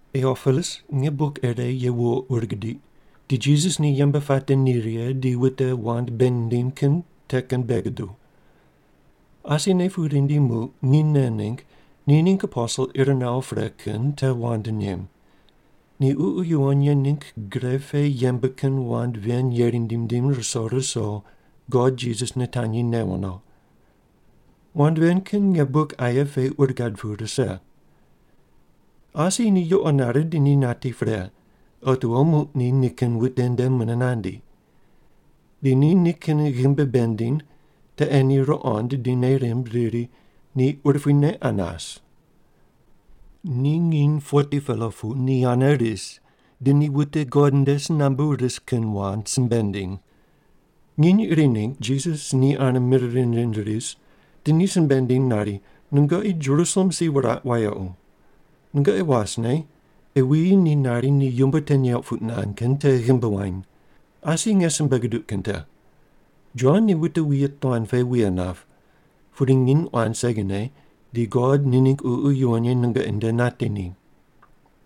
Tiopilus, nge buk ire ye wuwo ur gidiq, di Jisas ni yembe puate ni righe di wute wand bei nindim kin te kin bei guduw. Asine pu rindi muq nginy nen ningg ni ningg aposel ir nawo pre kin te wand nem. Ni Ququ Yuwon Ye ningg gre pe yembe kin wand ven yeri nindim nindim ruso ruso God Jisas nitanyi newo no. Wand ven kin nge buk aye pe ur gad pu rise. Asi ni yuqo nare di ni nati pre, otiwo muq ni nikin wute nde mune nandi. Di ni nikin ghimbi bei nindiny, te ei ni ruqond di nei rimb, riri, “Ni urupuine qa nas.” Ni nginy 40-pela pu ni ane ris, di ni wute God nde si nambu ris kin wand simbe nindiny. Nginy iri ningg Jisas ni ane mir rind rind ris di ni simbe nindiny nari, “Nungoqi Jerusalem si wuraq wayequ. Nungoqi wasne, ei wuyi ni nari ni yumbo te neuq puq nand kin te ghimbi wany. Asi nge simbe guduq kin te. Jon ni wute wuye tuan pe wuye nap. Pudi nginy quan segine di God ni ningg Ququ Yuwon Ye nungoqi nde nati ni.”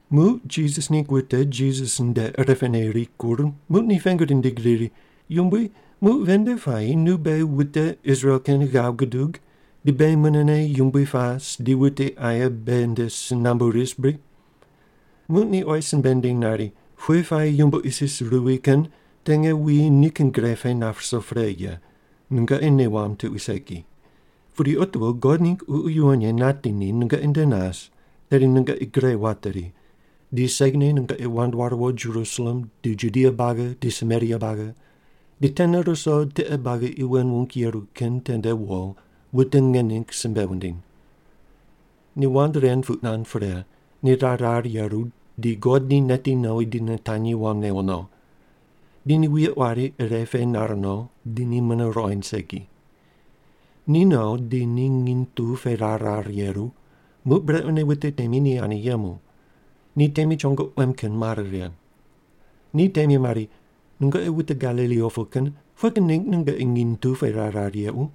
Muq Jisas ningg wute Jisas nde irepene rikur muq ni pengu rindig riri, “Yumbui, muq ven nde puayi nu beghi wute Israel kin ghav gudug, di beghi munene yumbui pas di wute aye beghi nde si nambu ris bri?” Muq ni oyi simbe nindiny nari, “Pughe puayi yumbo isis ruwi kin te nge wuyi nikin gre pe nap ruso pre ye, nungoqi nei wamb tuqui segi. Pudi otiwo God ningg Ququ Yuwon Ye nati ni nungoqi nde nas, tedi nungoqi gre wateri. Di segine nungoqi wand ware wo Jerusalem, di Judia buagi, di Samaria buagi, di tene ruso tiqe buagi qi wen wung yeru kin tende wo, wute nge ningg simbe wundiny.” Ni wand ren puq nand pre, ni rar rar yeru, di God ni neti nowi di nitanyi wam newo no. Di ni wuye quari ire pe nar no, di ni mune ruqoind segi. Ni no di ni nginy tu pe rar rarne yeru, muq brequne wute temi ni ane yemu. Ni temi chongo quem kin mare righe. Ni temi mari, “Nungoqi wute Galili opu kin pughe kin ningg nungoqi nginy tu pe rar rar yequ?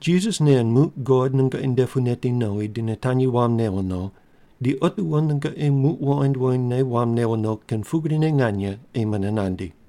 Jisas nen muq God nungoqi nde pu neti nowi di nitanyi wam newo no, di otiwo nungoqi muq wuqoind wuqoindne wam newo no kin pugrine nganye ei mune nandi.”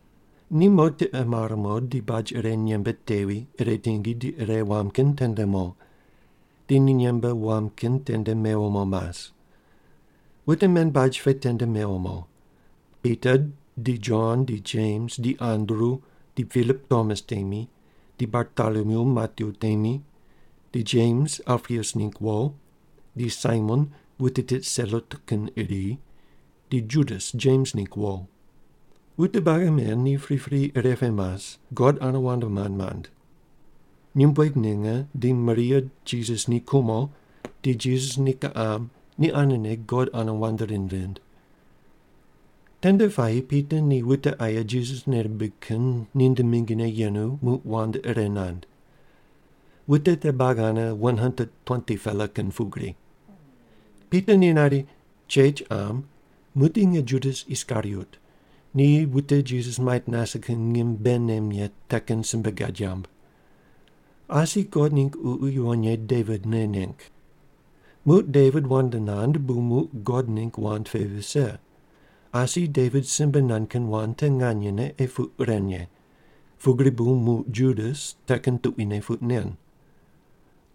Ni mo tiqe mar mo, di baj ire nyembe tevi, ire tingi, di ire wam kin tende mo. Di ni nyembe wam kin tende mewo mo mas. Wute men baj pe tende mewo mo: Pita di Jon di Jems di Andru, di Pilip Tomas temi, di Bartolomyu Matyu temi, di Jems Alpius ningg wo, di Saimon wute tit Selot kin iri, di Judas Jems ningg wo. Wute buagi men ni pripri ire pe mas God ane wand mand mand. Nyumbueg ninge di Maria Jisas ni kumo di Jisas ni kiqam ni anene God ane wand rind rind. Tende puayi Pita ni wute aye Jisas nei rimbig kin ninde mingine yenu, muq wand ire nand. Wute te buagi ane 120-pela kin pugri. Pita ni nari, “Chech qam, muqdi nge Judas Iskariot ni wute Jisas mait nase kin ngim bei nem ye te kin simbe gad yamb. Asi God ningg Ququ Yuwon Ye Devit nei neng. Muq Devit wand nand, bu muq God ningg wand pe vise. Asi Devit simbe nand kin wand te nganyene ei puq ren ye, pugri bu muq Judas te kin tuquine puq nen.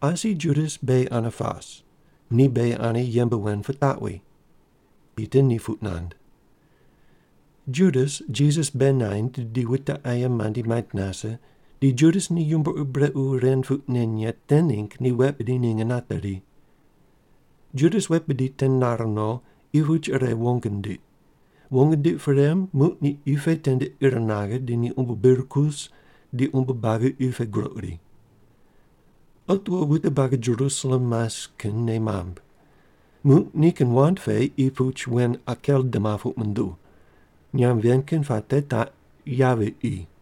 Asi Judas beghi ane pas. Ni beghi ane yembe wen pitaqwi.” Pita ni puq nand. (Judas Jisas bei naind di wute aye mandi mait nase di Judas ni yumbo ur brequ ren puq nen ye te ningg ni wet bidi ninge nateri. Judas wet bidi te nare no, qi puch ire wong nindiq. Wong nindiq pre, muq ni qi pe tende ir naghe, di ni umbo bir kus, di umbo buagi qi pe groq ri. Otiwo wute buagi Jerusalem mas kin nei mamb. Muq nikin wand pe qi puch wen “Akeldama” puq munduw. Nyamb ven kin puate taq pugri: Yavi qi.)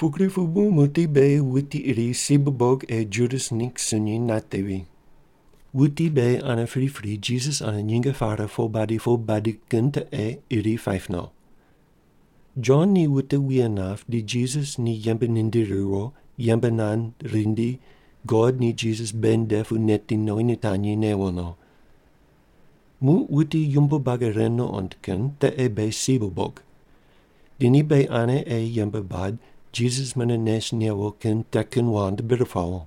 “Pugri pu bu muqdi beghi wuti iri si bubog ei Judas ningg sunyi natevi. Wuti beghi ane pripri Jisas ane nyinge pare po badi po badi kin te ei iri paip no. Jon ni wute wuye nap, di Jisas ni yembe nindiri riwo, yembe nand rindi God ni Jisas beghi nde pu neti nowi nitanyi newo no. Muq wuti yumbo buagi ren nuqond kin te ei beghi si bubog. Di ni beghi ane ei yembe bad, Jisas mune nes newo kin te kin wand bir pawo.”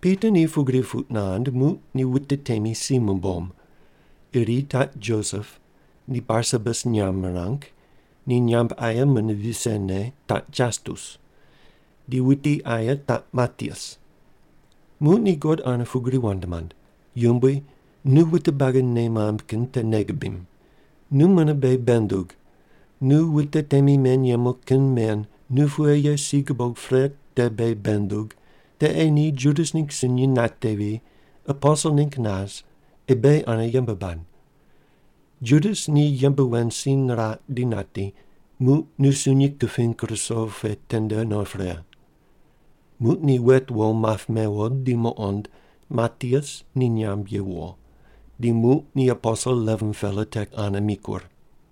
Pita ni pugri puq nand, muq ni wute temi si mumbom. Iri taq Josep, ni Barsabas nyamb mirang, ni nyamb aye mune visene, taq Jastus. Di wuti aye taq Matias. Muq ni God ane pugri wand mand, “Yumbui, nu wute buagi nei mamb kin te nei gubim. Nu mune beghi bei ndug, nu wute temi men yemu kin men nu pughe ye si gubog pre te beghi bei ndug, te ei ni Judas ningg sunyi natevi, aposel ningg nas ei beghi ane yembe bad. Judas ni yembe wen si niraq di nati, muq nu sunyi kuping ruso pe tende no pre.” Muq ni wet wo map mewo di muqond Matias ni nyamb ye wuwo. Di muq ni aposel 11-pela te ane mikur.